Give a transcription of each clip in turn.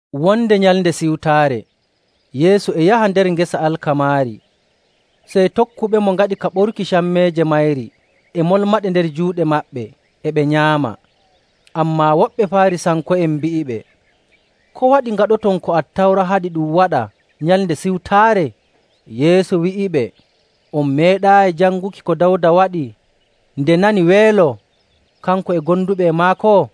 Wonde Nyalnde Siwtaare Yeesu e yaha nder ngesa alkamaari, sey tokkuɓemo ngaɗi ka ɓoruki cammeeje mayri e molmaɗe nder juuɗe maɓɓe, e ɓe nyaama.. Ammaa woɓɓe Faarisanko'en mbi'iɓe, “Ko waɗi ngaɗoton ko Attawra haɗi ɗum waɗa Nyalnde Siwtaare?” Yeesu wi'iɓe, “On meeɗaayi janguki ko Dawda waɗi nde nani weelo, kanko e gonduɓe e maako?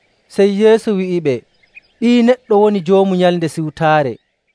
Sey Yeesu wi'iɓe, “Ɓii Neɗɗo woni Joomu Nyalnde Siwtaare.”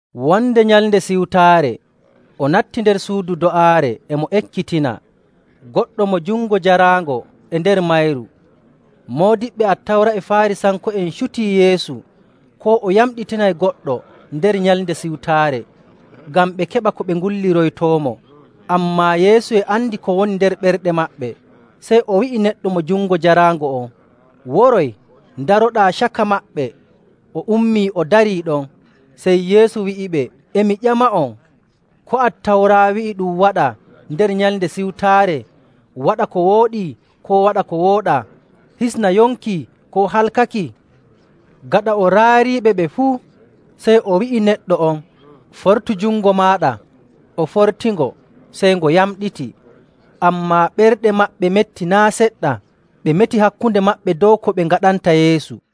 Wonde Nyalnde Siwtaare o natti nder suudu do'aare, e mo ekkitina. Goɗɗo mo jungo jaraango e nder mayru. Moodiɓɓe Attawra e Faarisanko'en cutii Yeesu koo o yamɗitinay goɗɗo nder Nyalnde Siwtaare, ngam ɓe keɓa ko ɓe ngulliroytoomo. Ammaa, Yeesu e andi ko woni nder ɓerɗe maɓɓe, sey o wi'i neɗɗo mo jungo jaraango on, “Woroy, ndaroɗaa caka maɓɓe.” O ummii, o darii ɗon. Sey Yeesu wi'iɓe, “E mi ƴama'on, ko Attawra wi'i ɗum waɗa nder Nyalnde Siwtaare, waɗa ko wooɗi koo waɗa ko wooɗaa, hisna yonki koo halkaki?” Gaɗa o raariiɓe ɓe fuu, sey o wi'i neɗɗo on, “Fortu jungo maaɗa.” O fortingo, sey ngo yamɗiti. Ammaa ɓerɗe maɓɓe metti naa' seɗɗa, ɓe meti hakkunde maɓɓe dow ko ɓe ngaɗanta Yeesu.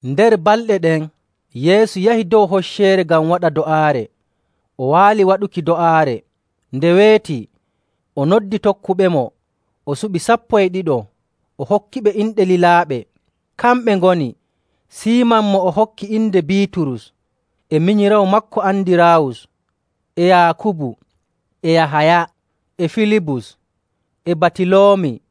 Nder balɗe ɗen, Yeesu yahi dow hocceere ngam waɗa do'aare. O waali waɗuki do'aare. Nde weeti, o noddi tokkuɓemo, o suɓi sappo e ɗiɗo, o hokkiɓe inde lilaaɓe. Kamɓe ngoni: Siiman mo o hokki inde Biiturus, e minyiraawo maako Andiraawus, e Yaakubu, e Yahaya, e Filibus, e Batiloomi,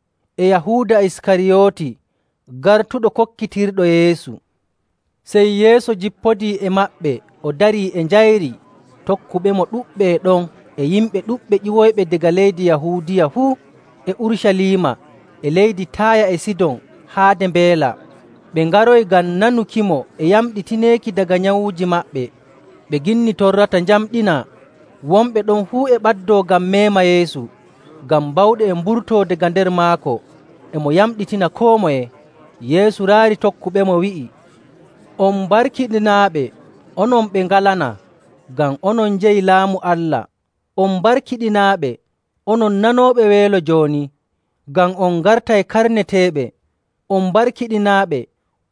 e Yahuuda ɓii Yaakubu, e Yahuuda Iskariyooti, gartuɗo kokkitirɗo Yeesu. Sey Yeesu jippodii e maɓɓe o darii e njayri. Tokkuɓemo ɗuɗɓe e ɗon e yimɓe ɗuɗɓe ƴiwoyɓe daga leydi Yahuudiya fuu, e Urucaliima, e leydi Taaya e Sidon haade mbeela. Ɓe ngaroyi ngam nanukimo e yamɗineeki daga nyawuuji maɓɓe. Ɓe ginni torrata njamɗinaa. Wonɓe ɗon fuu e ɓaddoo ngam meema Yeesu, ngam bawɗe e mburtoo daga nder maako, e mo yamɗitina koo moye. Yeesu raari tokkuɓemo, wi'i, “On barkiɗinaaɓe, onon ɓe ngalanaa, ngam onon njeyi Laamu Allah. “On barkiɗinaaɓe, onon nanooɓe weelo jooni, ngam on ngartay karneteeɓe. “On barkiɗinaaɓe,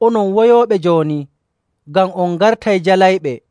onon woyooɓe jooni, ngam on ngartay jalayɓe.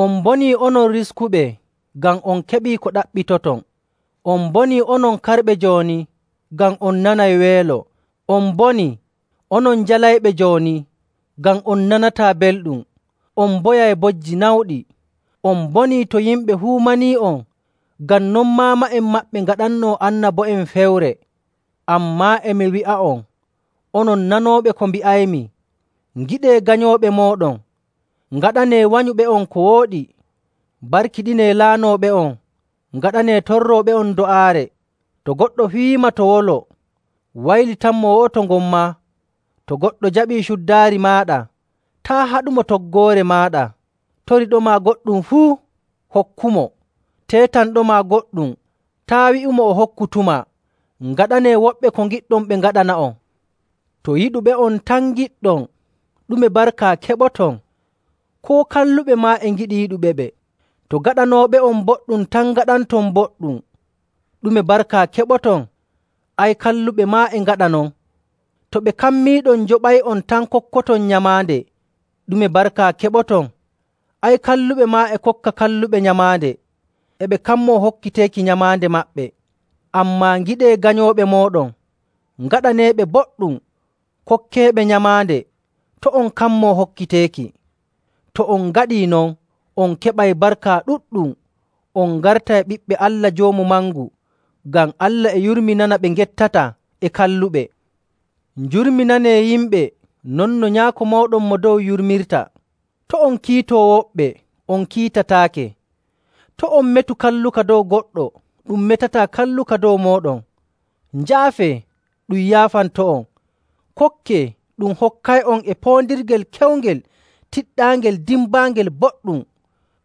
“On mbonii, onon riskuɓe, ngam on keɓii ko ɗaɓɓitoton. “On mbonii, onon karɓe jooni, ngam on nanay weelo. “On mbonii, onon jalayɓe jooni, ngam on nanataa belɗum, on mboyay bojji nawɗi. “On mbonii to yimɓe fuu manii'on, ngam non maama'en maɓɓe ngaɗannoo annabo'en fewre. “Ammaa e mi wi'a'on onon nanooɓe ko mbi'aymi: Ngiɗee ganyooɓe mooɗon, ngaɗanee wanyuɓe'on ko wooɗi, mbarkiɗinee laanooɓe'on, ngaɗanee torrooɓe'on do'aare. To goɗɗo fiyiima to wolo, waylitanmo wo'oto ngon maa. To goɗɗo jaɓii cuddaari maaɗa, taa' haɗumo toggoore maaɗa. Toriiɗoma goɗɗum fuu, hokkumo. Teetanɗoma goɗɗum, taa' wi'imo o hokkutumaa. Ngaɗanee woɓɓe ko ngiɗɗon ɓe ngaɗana'on.. “To yiɗuɓe'on tan ngiɗɗon, ɗume barka keɓoton? Koo kalluɓe maa e ngiɗi yiɗuɓeɓe. To gaɗanooɓe'on boɗɗum tan ngaɗanton boɗɗum, ɗume barka keɓoton? Ay, kalluɓe maa e ngaɗa non. To ɓe kammiiɗon njoɓay'on tan kokkoton nyamaande, ɗume barka keɓoton? Ay, kalluɓe maa e kokka kalluɓe nyamaande, e ɓe kammoo hokkiteeki nyamaande maɓɓe. Ammaa ngiɗee ganyooɓe mooɗon, ngaɗaneeɓe boɗɗum, kokkeeɓe nyamaande, to' on kammoo hokkiteeki. To on ngaɗii non, on keɓay barka ɗuɗɗum, on ngartay ɓiɓɓe Allah Joomu Mangu. Ngam Allah e yurminana ɓe ngettataa e kalluɓe. Njurminanee yimɓe non no Nyaako mooɗon Mo Dow yurmirta. “To' on kiito woɓɓe, on kiitataake. To' on metu kalluka dow goɗɗo, ɗum metataa kalluka dow mooɗon. Njaafee, ɗum yaafanto'on. Kokkee, ɗum hokkay'on e poondirgel kewngel tiɗɗaangel dimbaangel boɗɗum,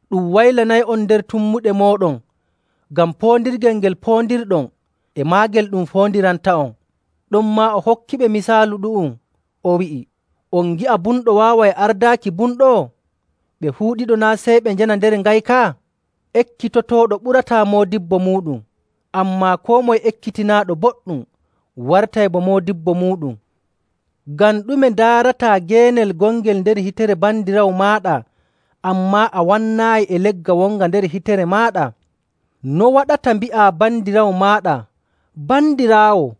ɗum waylanay'on nder tummuɗe mooɗon, ngam poondirgel ngel poondirɗon, e maagel ɗum foondiranta'on.” Ɗonmaa o hokkiɓe misaalu ɗu'um, o wi'i, “On ngi'a bumɗo waaway ardaaki bumɗo? Ɓe fuu ɗiɗo naa' sey ɓe njana nder ngayka?. Ekkitotooɗo ɓurataa moodibbo muuɗum, ammaa koo moye ekkitinaaɗo boɗɗum wartay bo moodibbo muuɗum.. “Ngam ɗume ndaarataa geenel gongel nder hitere bandiraawo maaɗa, ammaa a wannaayi e legga wonga nder hitere maaɗa? No waɗata mbi'aa bandiraawo maaɗa, ‘Bandiraawo,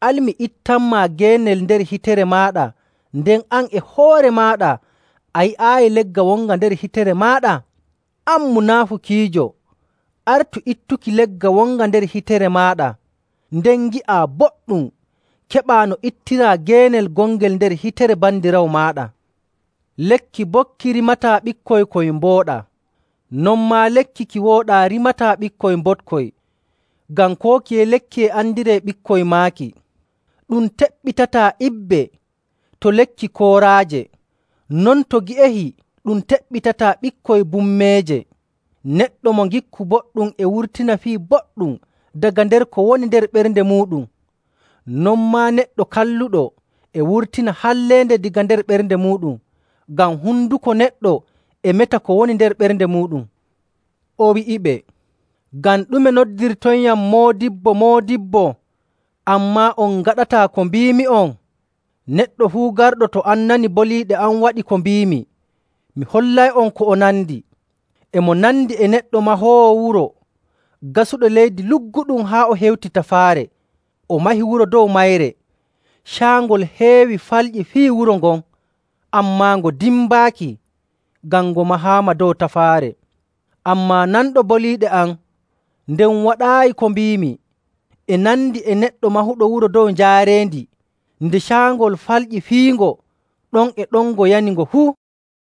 al mi ittanmaa geenel nder hitere maaɗa,’ nden an e hoore maaɗa a yi'aayi legga wonga nder hitere maaɗa? An munaafukiijo, artu ittuki legga wonga nder hitere maaɗa, nden ngi'aa boɗɗum keɓaa no ittiraa geenel gongel nder hitere bandiraawo maaɗa. “Lekki boɗki rimataa ɓikkoy koy mbooɗaa, non maa lekki ki wooɗaa rimataa ɓikkoy mboɗkoy. Ngam koo kiye lekki e andiree ɓikkoy maaki. Ɗum teɓɓitataa ibbe to lekki kooraaje, non to gi'ehi ɗum teɓɓitataa ɓikkoy bummeeje.. Neɗɗo mo ngikku boɗɗum e wurtina fii boɗɗum daga nder ko woni nder ɓernde muuɗum. Non maa neɗɗo kalluɗo e wurtina halleende daga nder ɓernde muuɗum, ngam honduko neɗɗo e meta ko woni nder ɓernde muuɗum.”. O wi'iɓe, “Ngam ɗume noddirtoyyam, ‘Moodibbo, Moodibbo,’ ammaa on ngaɗataa ko mbiimi'on? Neɗɗo fuu garɗo to am nani boliiɗe am waɗi ko mbiimi, mi hollay'on ko o nandi. E mo nandi e neɗɗo mahoowo wuro gasuɗo leydi lugguɗum haa o hewti tafaare, o mahi wuro dow mayre. Caangol heewi falƴi fiyi wuro ngon, ammaa ngo dimbaaki, ngam ngo mahaama dow tafaare. Ammaa nanɗo boliiɗe am, nden waɗaayi ko mbiimi e nandi e neɗɗo mahuɗo wuro dow njaareendi. Nde caangol falƴi fiyingo, ɗon e ɗon ngo yani ngo fuu!”